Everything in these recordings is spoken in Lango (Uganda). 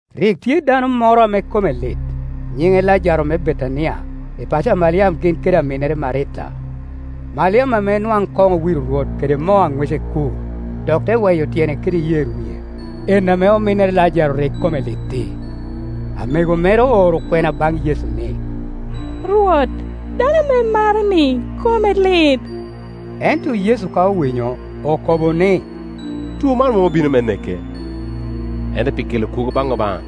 Rik tye dano moro ame kome lit, nyiŋe Lajaro me Betania, i paco a Maliam gin kede aminnere Marita. Maliam ame nwaŋ koŋ owiro Rwot kede moo a ŋwece kur, dok te we yo tyene kede yer wie, en ame ominnere Lajaro rik kome lit-ti. Amego mere ooro kwena baŋ Yecu ni, “Rwot, dano ame imaro-ni kome lit.” Ento Yecu ka owinyo, okobo ni, “Two man mom obino me neke, ento pi kela kwogo baŋ Obaŋa,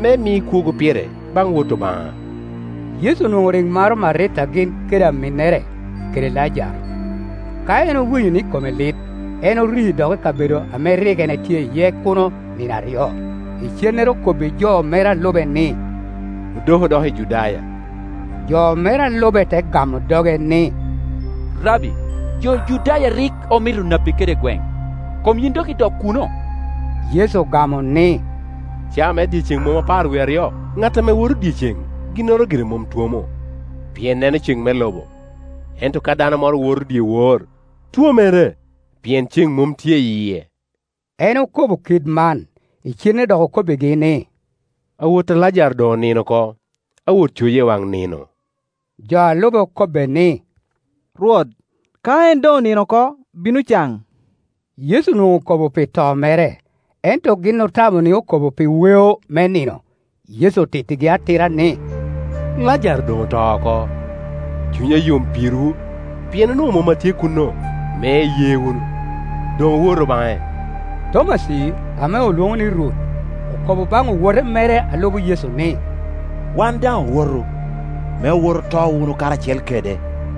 me mi kwogo pire baŋ Wot Obaŋa.” Yecu onwoŋo rik maro Marita gin kede aminnere, kede Lajaro. Ka en owinyo ni kome lit, en ori dok i kabedo ame rik etye iye kuno nino aryo. Icennere okobbi jo mere a lube ni, “Odoku doki i Judaya.” Jo mere a lube te gamo doge ni, “Rabbi, jo Judaya rik omito napi kede gweŋ, kom yin dok idok kuno?” Yecu ogamo ni, “Caa me dyeceŋ mom apar wie aryo? Ŋat ame wo to dyeceŋ ginnoro gire mom twomo, pien neno ceŋ me lobo. Ento ka dano moro woto dyewor, twomere, pien ceŋ mom tye i yie.” En okobo kit man, icennere dok okobbigi ni, “Awo ta Lajaro doŋonino oko, awot coye i wan nino.” Jo a lube okobbe ni, “Rwot, ka en doŋ onino oko, bino can.” Yecu onwoŋo okobo pi to mere, ento gin otamo ni okobo pi weo me nino. Yecu otittigi atira ni, “Lajaro doŋoto oko. Cunya yom pirwu pien onwoŋo mom atye kuno, me iye wunu. Doŋ owotu baŋe.” Tomaci, ame olwoŋo ni Rut, okobo baŋ owottere mere a lubo Yecu ni, “Wan daŋ owotu, me owot oto wunu karacel kede.”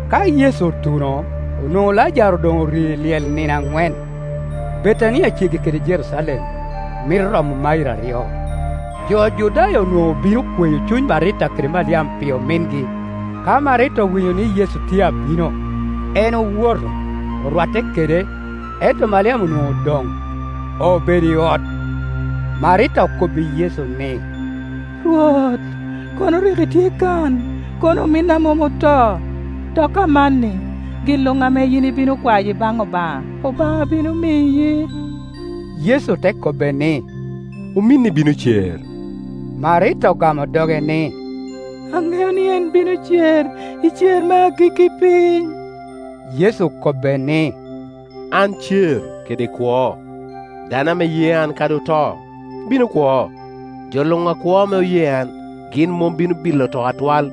Ka Yecu otuno, onwoŋo Lajaro doŋori i lyel nino aŋwen. Betania ceggi kede Jerucalem, mito romo mairo aryo. Jo Judaya onwoŋo obino kweyo cuny Marita kede Maliam pi omingi. Ka Marita owinyo ni Yecu tye abino, en owoto, orwatte kede, ento Maliam Onwoŋo odoŋ, obedo i ot. Marita okobbi Yecu ni, “Rwot, kono rik itye kan, kono ominna mom oto. Dok amanni gin Iuŋ ame yin ibino kwayo i baŋ Obaŋa, Obaŋa bino miyi.” Yecu te kobbe ni, “Ominni bino cer.” Marita ogamo doge ni, “Aŋeo ni en bino cer i cer me agikki piny.” Yecu okobbe ni, “An cer kede kwo; dano ame ye an kadi oto, bino kwo. Jo luŋ akwo ame oye an, gin mom bino bilo to atwal.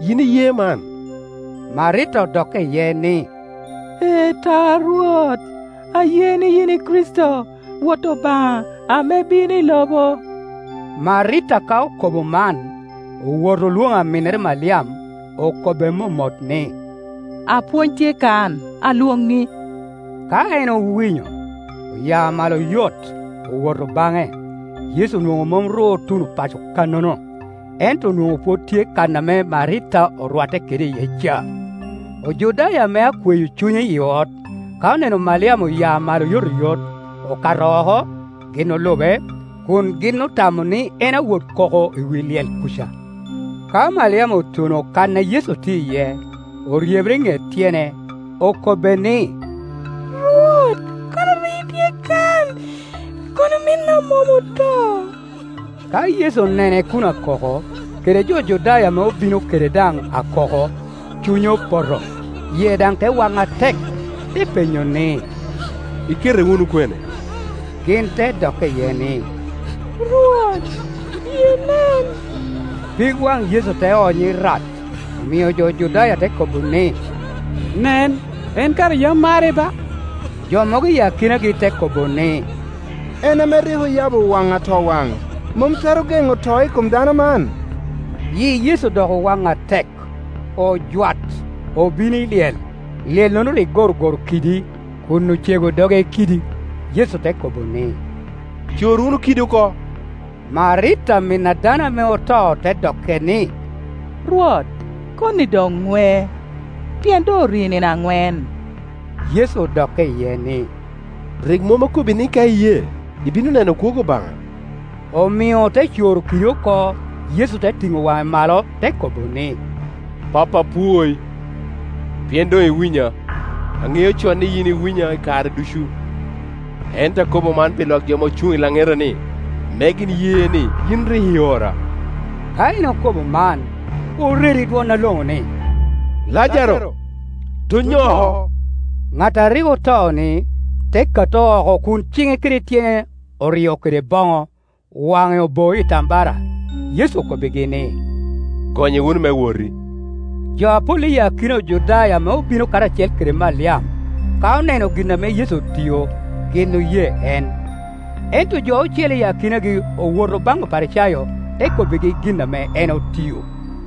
Yin iye man?” Marita odokke iye ni, “Ee ta, Rwot, aye ni yin i Kricito, Wot Obaŋa, ame bino i lobo.” Marita ka okobo man, owoto olwoŋo aminnere Maliam, okobbe momot ni, “Apwony tye kan, alwoŋi.” Ka en owinyo, ova malo oyot, owoto baŋe. Yecu onwoŋo mom otuno paco kannono, ento onwoŋo pwod tye kan ame Marita orwatte kede iye ca. Ojudaya ame akweyo cunye i ot, ka oneno Maliam oya malo oyotoyot, okato oko, gin olube, kun gin otamo ni en awot koko i wi lyel kuca. Ka Maliam otuno kan a Yecu tye iye, oryebere i ŋet tyene, okobbe ni, “Rwot, kono rik itye kan, kono ominna mom oto.” Ka Yecu onene kun akoko, kede jo Judaya ame obino kede daŋ akoko, cunye opoto, yie daŋ te wan atek. Te penyo ni, “Ikete wunu kwene?” Gin te dokke iye ni, “Rwot, biye inen.” Pig waŋ Yecu te ony irat. Omio jo Judaya te kobo ni, “Nen, en kara yam mare ba!” Jo mogo i akinagi te kobo ni, “En ame rik oyabo waŋ atowaŋ mom twero geŋo to i kom dano man?” Yi Yecu dok owaŋ atek, ojwat, obino i lyel; lyellono rik gorogoro kidi, kun ocego doge i k idi. Yecu te kobo ni, “Cor wunu kidi oko,” Marita amin a dano ame oto te dokke ni, “Rwot, koni doŋ ŋwe, pien doŋ ori nino aŋwen.” Yecu odokke iye ni, “Rik mom akobbi ni ka iye, ibino neno kwogo Obaŋa?” Omio ote coro kidi oko. Yecu te tiŋo waŋe malo, te kobo ni, “Pappa, apwoi pien doŋ iwinya. An aŋeo con ni yin iwinya i kare ducu, ento akobo man pi lwak jo ame ocuŋ i laŋeta-ni, me gin ye ni yin rik iora.” Ka en okobo man, oredo i dwon aloŋo ni, “Lajaro, donyo oko!” Ŋat a rik oto-ni, te kato oko kun ciŋe kede tyene orio kede boŋo, waŋe oboo i tambara. Yecu okobbigi ni, “Gonye wunu me woti.” Jo apol i akina Ojudaya ame obino karacel kede Maliam, ka oneno gin ame Yecu otio, gin oye en. Ento jo ocele i akinagi owoto baŋ Oparicayo, te kobbigi gin ame en otio.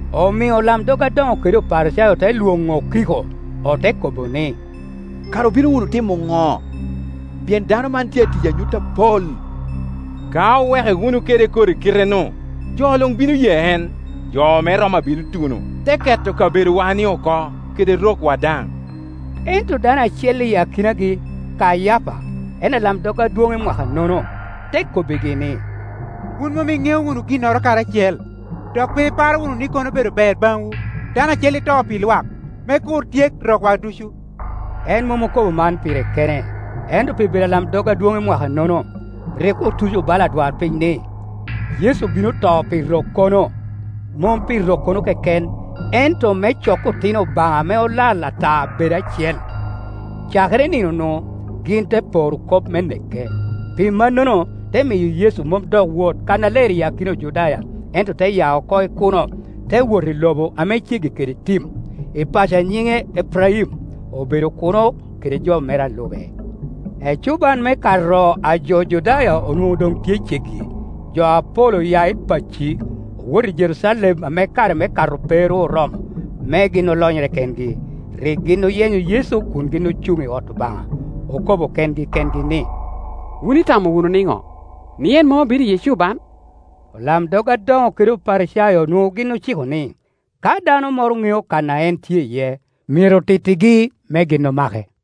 Omio olamdog adoŋo kede Oparicayo te lwoŋo okiko, ote kobo ni, “Kara obino wunu timo ŋo? Pien dano man tye a tiyo anyut apol. Ka owe ke wunu kede kodi kite-nu, jo luŋ bino ye en, jo me Roma bino tuno, te ke to kabedowa-ni oko, kede rokwa daŋ.” Ento dano acel i akinagi, Kayapa, en alamdog adwoŋ i mwaka nono, te kobbigi ni, “Wun mom iŋeo wunu ginnoro kadi acel, dok pe iparo wunu ni kono obedo ber baŋwu, dano acel i to pi lwak, me kur tyek rokwa ducu.” En mom okobo man pire kene, ento pi bedo alamdog adwoŋ i mwaka-nono, rik otuco bala adwarpiny ni, Yecu bino to pi rokkono; mom pi rokkono keken, ento me cok otino Obaŋa ame olal ata bed acel. Cakere i nino-nu, gin te poro kop me neke. Pi mannono, te miyo Yecu mom dok woto kannaler i akina Ojudaya, ento te ya oko i kuno, te wot i lobo ame ceggi kede tim, i paco a nyiŋe Epraim; obedo kuno kede jo mere a lube. Ecuban me kato a jo Judaya onwoŋo doŋ tye ceggi, jo apol oya i pacci, owoto i Jerucalem ame kare me Kato pe ru oromo, me gin olonyere kengi. Rik gin oyenyo Yecu, kun gin ocuŋ i ot Obaŋa, okobo kengi kengi ni, “Wun itamo wunu nino? Ni en mom abino i ecuban?” Olamdog adoŋo kede Oparicayo onwoŋo gin ociko ni, ka dano moro ŋeo kan a en tye iye, myero tittigi, me gin omake.